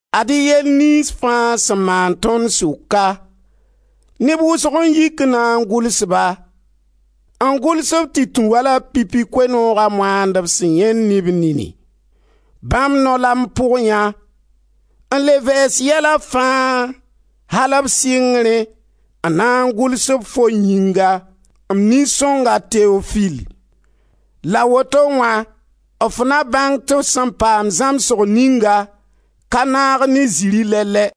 Ad-y yɛl niyns fãa sẽn maan tõnd sʋka, neb wʋsg n yik n na n gʋls ba, n gʋls-b tɩ tũ wala pipi Koe-nooga moandb sẽn yãend ne b nini. Bãmb nao la m pʋgyã, n le vɛɛs yɛla fãa, al b sɩngrẽ n na n gʋls-b fo yĩnga, m nin-sõngo Teofil. La woto wã f na bãng tɩ f sẽn paam zãmsgo ninga ka naag ne zirẽ lɛ-lɛ.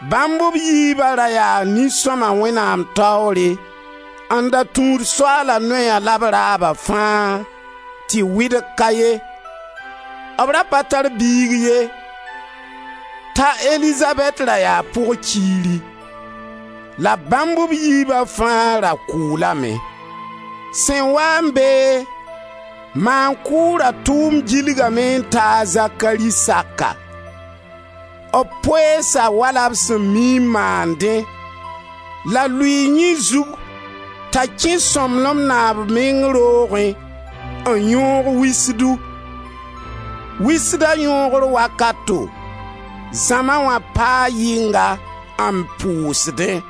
Bãmb b yiiba da yaa nin-sõma Wẽnnaam taoore n da tũud Soaala noya la b raaba fãa, tɩ wɩdg ka ye. B ra pa tar biig ye, t'a Elizabɛt ra yaa pɩg-kiiri; la bãmb b yiiba fãa ra kʋʋlame. Sẽn waa n beẽ, maan-kʋʋra tʋʋmd gilgame n ta a Zakari saka. B poeesa wala b sẽn mii n maandẽ, la lʋɩɩ yẽ zug, t'a kẽ Sõmblem Naab meng roogẽ n yõog wisdu. Wisda yõogr wakato, zãma wã paa yɩnga n pʋsdẽ.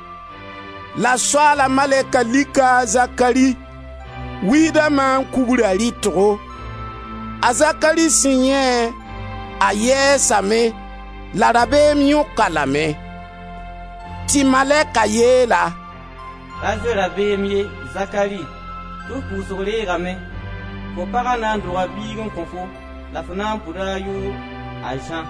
La Soaala malɛka lika a Zakari, wisda maan-kugra rɩtgo. A Zakari sẽn yãe-a, a yɛɛsame la rabeem yõk-a lame. Tɩ malɛka yeel-a: «Ra zoe rabeem ye, Zakari, tɩ f pʋʋsg reegame, fo pag na n doga biig n kõ-fo la f na n pʋda a yʋʋr a Zã.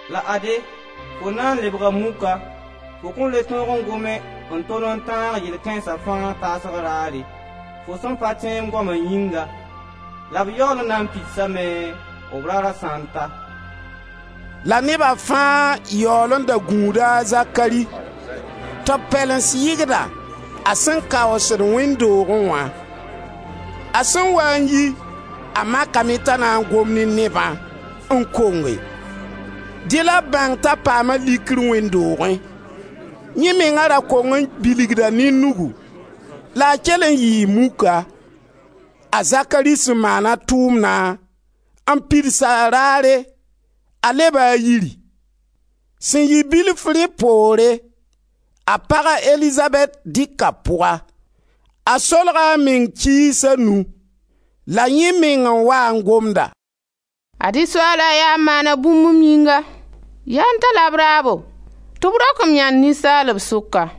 La ade, fo na n lebga muka, fo kõn le tõog n gome, n tol n tãag yɛl kãensa fãa taasg raare, fo sẽn pa tẽ m goama yĩnga, la b yaool n na n pidsame, b raara sã n ta.» La neba fãa yaool n da gũuda a Zakari, tɩ b pɛlens yɩgda a sẽn kaoosd wẽnd doogẽ wã. A sẽn waa n yi, a makame t'a na n gom ne nebã, n konge. Dẽ la b bãng t'a paama likr wẽnd doogẽ. Yẽ menga ra kong n bilgda ne nugu, la a kell n yɩɩ muka. A Zakari sẽn maan a tʋʋmna n pids a raare, a leba a yiri. Sẽn yɩ bilf rẽ poore, a paga, a Elizabɛt, dɩka pʋga; a solga a meng kiis a nu. La yẽ meng n waa n gomda: «Ad-y Soaala yaa n maana bũmb m yĩnga. Yaa n ta-la b raabo tɩ b rok m yãnd ninsaalb sʋka!»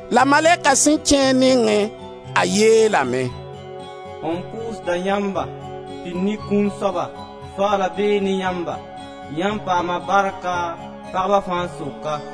La malɛka sẽn kẽ a nengẽ, a yeelame: «M pʋʋsda yãmba, pid ne kũun soaba! Soaala bee ne yãmba, yãmb paama barka, pagba fãa sʋka.»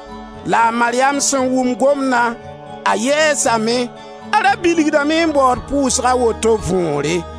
La a Maryam sẽn wʋm gomdã, a yɛɛsame; a ra bilgdame n baood pʋʋsg a woto võore.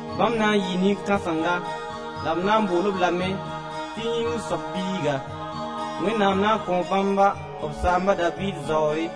Bãmb na n yɩɩ nin-kãsenga, la b na n bool-b lame tɩ yĩngr soab Biiga. Wẽnnaam na n kõ bãmba b saamba, a Daviid, zaoore,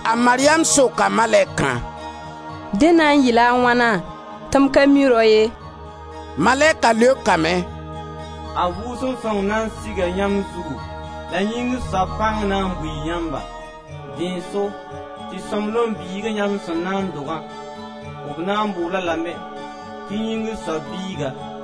A Maryam soka malɛkã: «Dẽ na n yɩ-la a wãna, tɩ m ka mi rao ye?» Malɛka leokame: «A Vʋʋsem Sõng na n siga yãmb zugu la yĩngr soab pãng na n bui yãmba. Dẽ n so tɩ sõmblem biiga yãmb sẽn na n dogã, b na n bool-b lame tɩ yĩngr soab Biiga.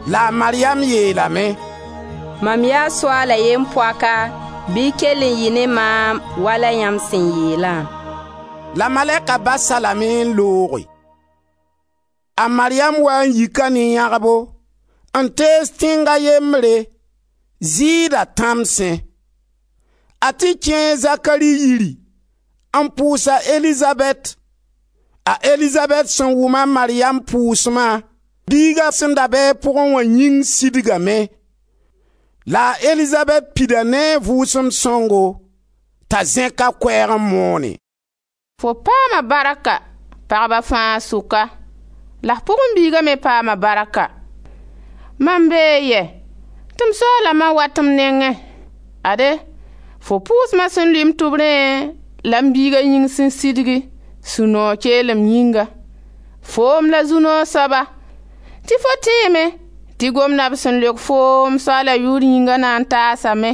La a Maryam yeelame: «Mam yaa Soaala yem-poaka, bɩ kell n yɩ ne maam wala yãmb sẽ yeelã.» La malɛka bas-a lame n looge. A Mariyam waa n yika ne yãgbo n tees tẽng a yembre, Zɩɩda tãmsẽ. A tɩ kẽe a Zakari yiri n pʋʋs a Elizabɛt. A Elizabɛt sẽn wʋm a Maryam pʋʋsma, biiga sẽn da be a pʋgẽ wã yĩng sidgame. La a Elizabɛt pida ne a Vʋʋsem Sõngo, t'a zẽk a koɛɛg n moonẽ: «Fo paama barka, pagba fãa sʋka, la f pʋgẽ biiga me paama barka. Mam bee yɛ, tɩ m Soaala ma wat m nengẽ? Ade, fo pʋʋsma sẽn lʋɩ m tʋbrẽ la m biiga yĩng sẽn sidgi, sũ-noog keelem yĩnga. Foom la zu-noog soaba, tɩ fo tẽeme tɩ gomna b sẽn leok foom, Soaala yʋʋr yĩnga, na n taasame.»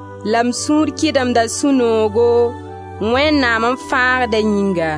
la m sũur kɩdemda sũ-noogo, Wẽnnaam m Fãagda yĩnga.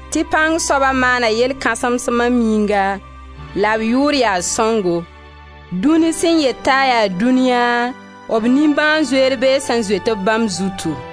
Tɩ Pãng soab maana yɛl kãsens mam yĩnga, la b yʋʋr yaa sõngo. Dũni sẽn yet t'a yaa dũniya, b nimbãan-zoeer bee sẽn zoet-b bãmb zutu.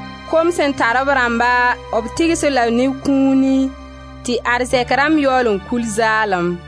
Kom sẽn tar b rãmba, b tɩgs-b la ne kũuni, tɩ arzɛk rãmb yaool kul zaalem.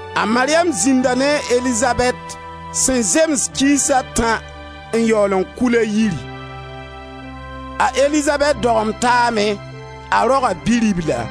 A Maryam zĩnda ne a Elizabɛt sẽn zems kiis a tã n yaool n kul a yiri. A Elizabɛt dogem taame; a roga bi-ribla.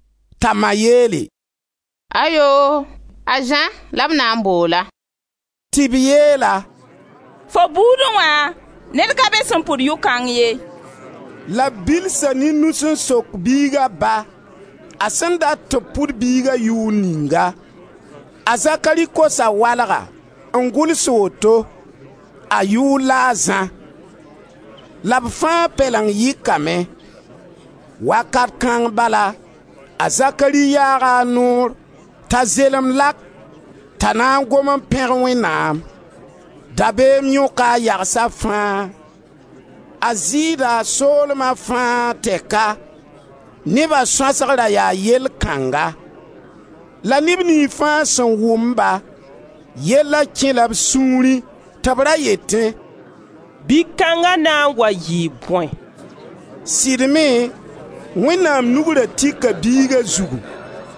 T'a ma yeele: «Ayoo! A Zã la b na n bool-a.» Tɩ b yeel-a: «Fo buudẽ wã, ned ka be sẽn pʋd yʋ-kãng ye.» La b bilsa ne nus n sok biiga ba a sẽn dat tɩ b pʋd biiga yʋʋr ninga. A Zakari kosa walga n gʋls woto: «A yʋʋr la a Zã.» La b fãa pɛleng yɩkame. Wakat kãng bala, a Zakari yaaga a noor t'a zelemd lak t'a na n gom n pẽg Wẽnnaam. Dabeem yõka a yagsa fãa. A Zɩɩda soolma fãa tɛka, neba sõasg ra yaa yell kãnga. La neb niyns fãa sẽn wʋm-ba, yella kɛ-la b sũurẽ tɩ b ra yetẽ: «Bi-kãnga na n wa yɩɩ bõe?» Sɩd me Wẽnnaam nug ra tika biiga zugu.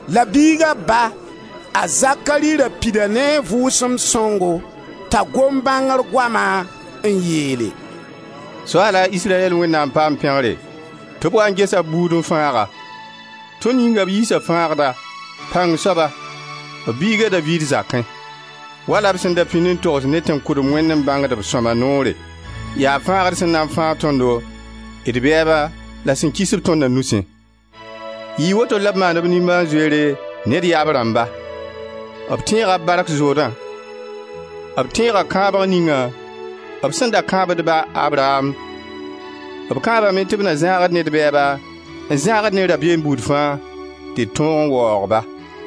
La biiga ba, a Zakari, ra pida ne a Vʋʋsem Sõngo, t'a gom bãngr goama n yeele: «Soaala, Israyɛl Wẽnnaam, paam pẽgre, tɩ b waa n gesa b buudu n fãag-a. Tõnd yĩnga b yiisa Fãagda, Pãng soaba, b biiga Daviid zakẽ. Wala b sẽn da pĩnd n togs ne tẽn-kʋdem wẽnnẽ bãngdb sõma noore, yaa Fãagd sẽn na fãag tõndo d bɛɛba la sẽn kis-b tõnda nusẽ. Yɩɩ woto la b maan b nimbãan-zoeere ne d yaab rãmba. B tẽega b bark zoodã, b tẽega kãabg ningã, b sẽn da kãab d ba, a Abraam. B kãabame tɩ b na zãag-d ne d bɛɛba, n zãag-d ne rabeem buud fãa, tɩ d tõog n waoog-ba,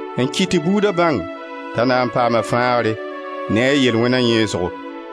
n kɩt tɩ buuda bãng t'a na n paama fãagre ne a yel-wẽna yẽesgo,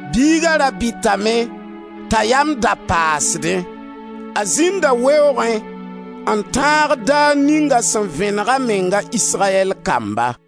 Biiga ra bɩtame t'a yam da paasdẽ. A zĩnda weoogẽ n tãag daar ning a sẽn vẽneg a meng a Israyɛl kamba.